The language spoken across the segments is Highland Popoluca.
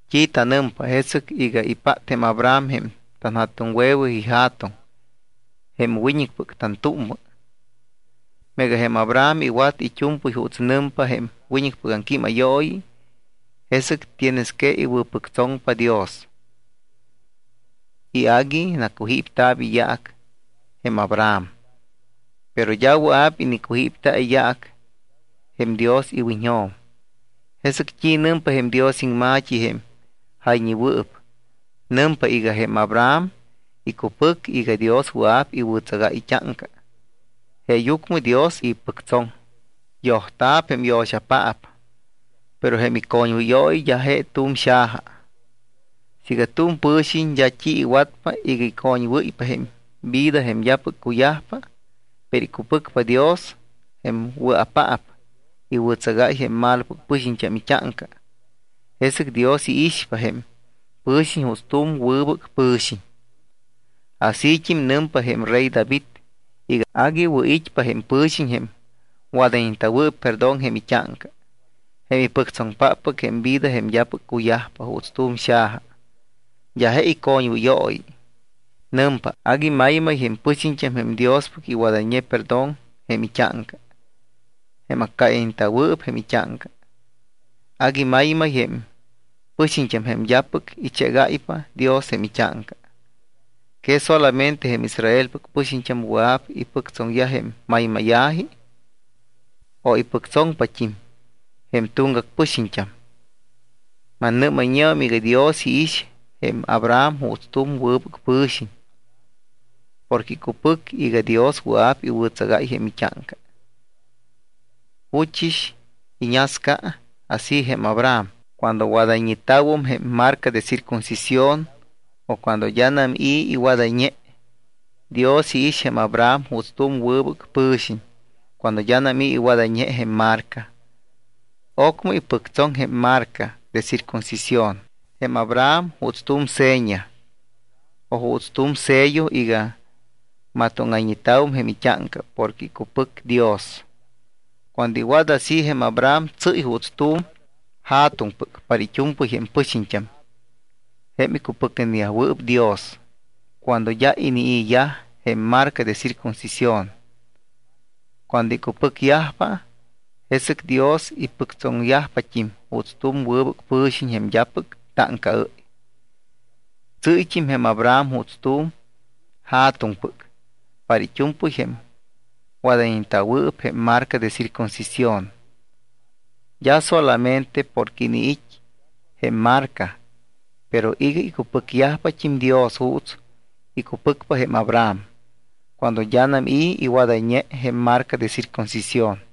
¿T́i tanɨmpa jesɨc iga ipát jém Abraham jém tanja̱tuŋwe̱we ija̱tuŋ, jém wiñɨcpɨc tantúmmɨ? Meega jém Abraham iwat it́u̱mpɨy juuts nɨmpa jém wiñɨcpɨc aŋquímayooyi, jesɨc tienes que iwɨ̱pɨctsoŋpa Dios y agui nacujípta̱p iyaac jém Abraham. Pero d́a wɨa̱p inicujípta̱ iyaac jém Dios iwiñjo̱m. ¿Jesɨc t́i nɨmpa jém Dios iŋma̱t́i jém jayñewɨɨp? Nɨmpa iga: “Jém Abraham icupɨc iga Dios wɨa̱p iwɨ̱tsagáy it́áŋca. Jeeyucmɨ Dios ipɨctsoŋ.” Yojta̱p jém yo̱xapaap, pero jém icoñwɨyooyi d́a je tu̱m xaja. Siiga tu̱m pɨ̱xiñ d́a t́i iwatpa iga icoñwɨ́ypa jém vida jém d́apɨc cuyajpa, pero icupɨcpa Dios jém wɨa̱paap iwɨ̱tsagáy jém malopɨc pɨxiñt́am it́áŋca, jesɨc Dios iixpa jém pɨ̱xiñ juuts tu̱m wɨbɨc pɨ̱xiñ. Asít́im nɨmpa jém rey David iga agui wɨ̱ it́pa jém pɨ̱xiñ jém wadayñeta̱wɨɨp perdón jém it́áŋca jém ipɨctsoŋpáppɨc jém vida jém d́apɨc cuyajpa juuts tu̱m xaja, d́a je icoñwɨyooyi. Nɨmpa: Agui maymay jém pɨxiñt́am jém Diospɨc iwadayñe perdón jém it́áŋca, jém accáyayñeta̱wɨɨp jém it́áŋca. Agui maymay jém pɨxiñt́am jém d́apɨc ichégáypa Dios jém it́áŋca. ¿Que solamente jém Israelpɨc pɨxiñt́am wɨa̱p ipɨctsoŋyaj jém maymáya̱ji? ¿O ipɨctsoŋpat́im jém tuŋgac pɨxiñt́am? Mannɨ́mayñeum iga Dios iix jém Abraham juuts tu̱m wɨbɨc pɨ̱xiñ porque icupɨc iga Dios wɨa̱p iwɨ̱tsagáy jém it́áŋca. ¿Juchɨs iñasca así jém Abraham? ¿Cuando wadayñeta̱wum jém marca de circuncisión o cuando d́anam i̱ iwadayñe? Dios iix jém Abraham juuts tu̱m wɨbɨc pɨ̱xiñ cuando d́anam i̱ iwadayñe jém marca. Ocmɨ ipɨctsoŋ jém marca de circuncisión jém Abraham juuts tu̱m seña o juuts tu̱m sello iga matóŋayñeta̱wum jém it́áŋca porque icupɨcne Dios. Cuando iwat así jém Abraham tsɨ́y juuts tu̱m ja̱tuŋpɨc para it́u̱mpɨy jém pɨxiñt́am jém icupɨcneyajwɨɨp Dios cuando d́a inii̱yaj jém marca de circuncisión. Cuando icupɨcyajpa, jesɨc Dios ipɨctsoŋyajpat́im juuts tu̱m wɨbɨc pɨxiñ jém d́apɨc táŋcaɨ́y. Tsɨ́yt́im jém Abraham juuts tu̱m ja̱tuŋpɨc para it́u̱mpɨy jém wadayñeta̱wɨɨp jém marca de circuncisión. D́a solamente porque iniit́ jém marca, pero iga icupɨcyajpat́im Dios juuts icupɨcpa jém Abraham cuando d́anam i̱ iwadayñe jém marca de circuncisión.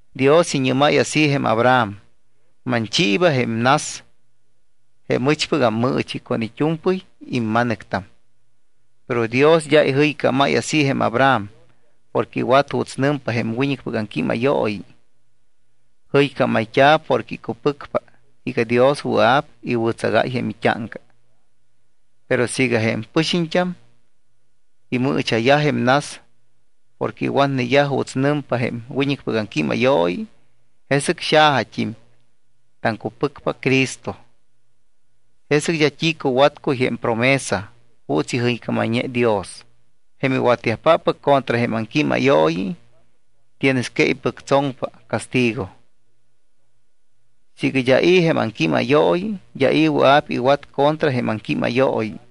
Dios iñɨ́máy así jém Abraham: “Manchiiba jém nas jém ɨchpɨc ammɨɨchi con it́u̱mpɨy imma̱nɨctam.” Pero Dios d́a ijɨycámáy así jém Abraham porque iwat juuts nɨmpa jém wiñɨcpɨc aŋquímayooyi. Jɨycámayt́a̱ porque icupɨcpa iga Dios wɨa̱p iwɨ̱tsagáy jém it́áŋca. Pero siiga jém pɨxiñt́am imɨɨcha̱yaj jém nas porque iwatneyaj juuts nɨmpa jém wiñɨcpɨc aŋquímayooyi, jesɨc xajat́im taŋcupɨcpa Cristo. Jesɨc d́a t́i cuwatcuy jém promesa juuts ijɨycámayñe Dios. Jém iwatyajpáppɨc contra jém aŋquímayooyi tienes que ipɨctsoŋpa castigo. Siiga d́a i̱ jém aŋquímayooyi, d́a i̱ wɨa̱p iwat contra jém aŋquímayooyi.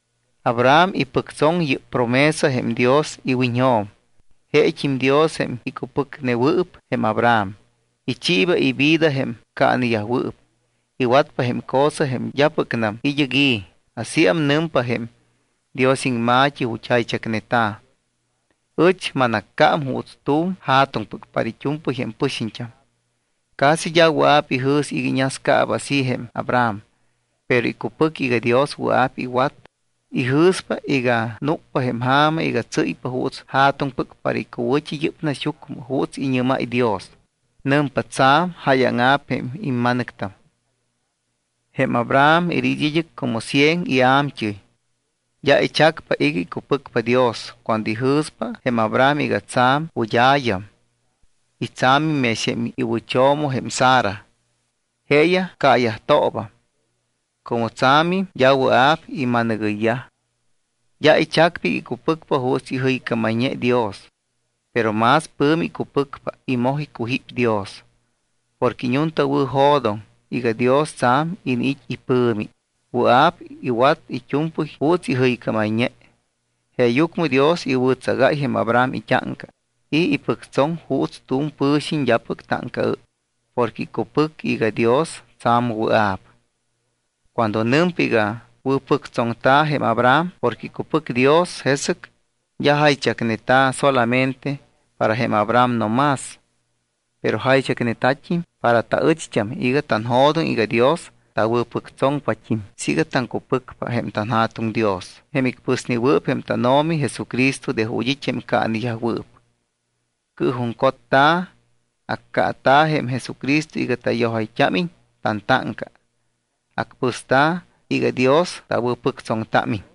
Abraham ipɨctsoŋ yɨ́p promesa jém Dios iwiñjo̱m. Jeet́im Dios jém icupɨcnewɨɨp jém Abraham, ichiiba ivida jém caaneyajwɨɨp. Iwatpa jém cosa jém d́apɨcnam id́ɨc i̱. Asíam nɨmpa jém Dios iŋma̱t́i ju̱t́ jaychacneta̱: “Ɨch manaccám juuts tu̱m ja̱tuŋpɨc para it́u̱mpɨy jém pɨxiñt́am.” Casi d́a wɨa̱p ijɨ̱s iga iñascaaba así jém Abraham, pero icupɨc iga Dios wɨa̱p iwat, ijɨ̱spa iga núcpa jém ja̱ma iga tsɨ́ypa juuts ja̱tuŋpɨc para icuwɨ̱t́i yɨ́p naxyucmɨ juuts iñɨ́máy Dios. Nɨmpa: “Tsa̱m jáyaŋa̱p jém imma̱nɨctam.” Jém Abraham iniit́ id́ɨc como cien ia̱mt́ɨy. D́a ichacpa iga icupɨcpa Dios cuando ijɨ̱spa jém Abraham iga tsa̱m wɨd́a̱yam y tsa̱mit́im mex jém iwɨcho̱mo jém Sara. Jeeyaj caayajtoobam. Como tsa̱mim, d́a wɨa̱p ima̱nɨgɨyyaj. D́a ichacpa iga icupɨcpa juuts ijɨycámayñe Dios. Pero más pɨ̱mi icupɨcpa y moj icujíp Dios. Porque iñuntawɨ̱jo̱doŋ iga Dios tsa̱m iniit́ ipɨ̱mi, wɨa̱p iwat it́u̱mpɨy juuts ijɨycámayñe. Jeeyucmɨ Dios iwɨ̱tsagáy jém Abraham it́áŋca y ipɨctsoŋ juuts tu̱m pɨ̱xiñ d́apɨc táŋcaɨ́y porque icupɨc iga Dios tsa̱m wɨa̱p. Cuando nɨmpa iga wɨ̱pɨctsoŋta̱ jém Abraham porque icupɨc Dios, jesɨc d́a jaychacneta̱ solamente para jém Abraham no más. Pero jaychacneta̱t́im para taɨcht́am iga tanjo̱doŋ iga Dios tawɨ̱pɨctsoŋpat́im siiga taŋcupɨcpa jém tanJa̱tuŋ Dios, jém icpɨsnewɨɨp jém tánO̱mi Jesucristo de ju̱t́ it́ jém caaneyajwɨɨp. Cɨɨjuŋcotta̱, accaata̱ jém Jesucristo iga tayojayt́ámiñ tantáŋca. Acpɨsta̱ iga Dios tawɨ̱pɨctsoŋtámiñ.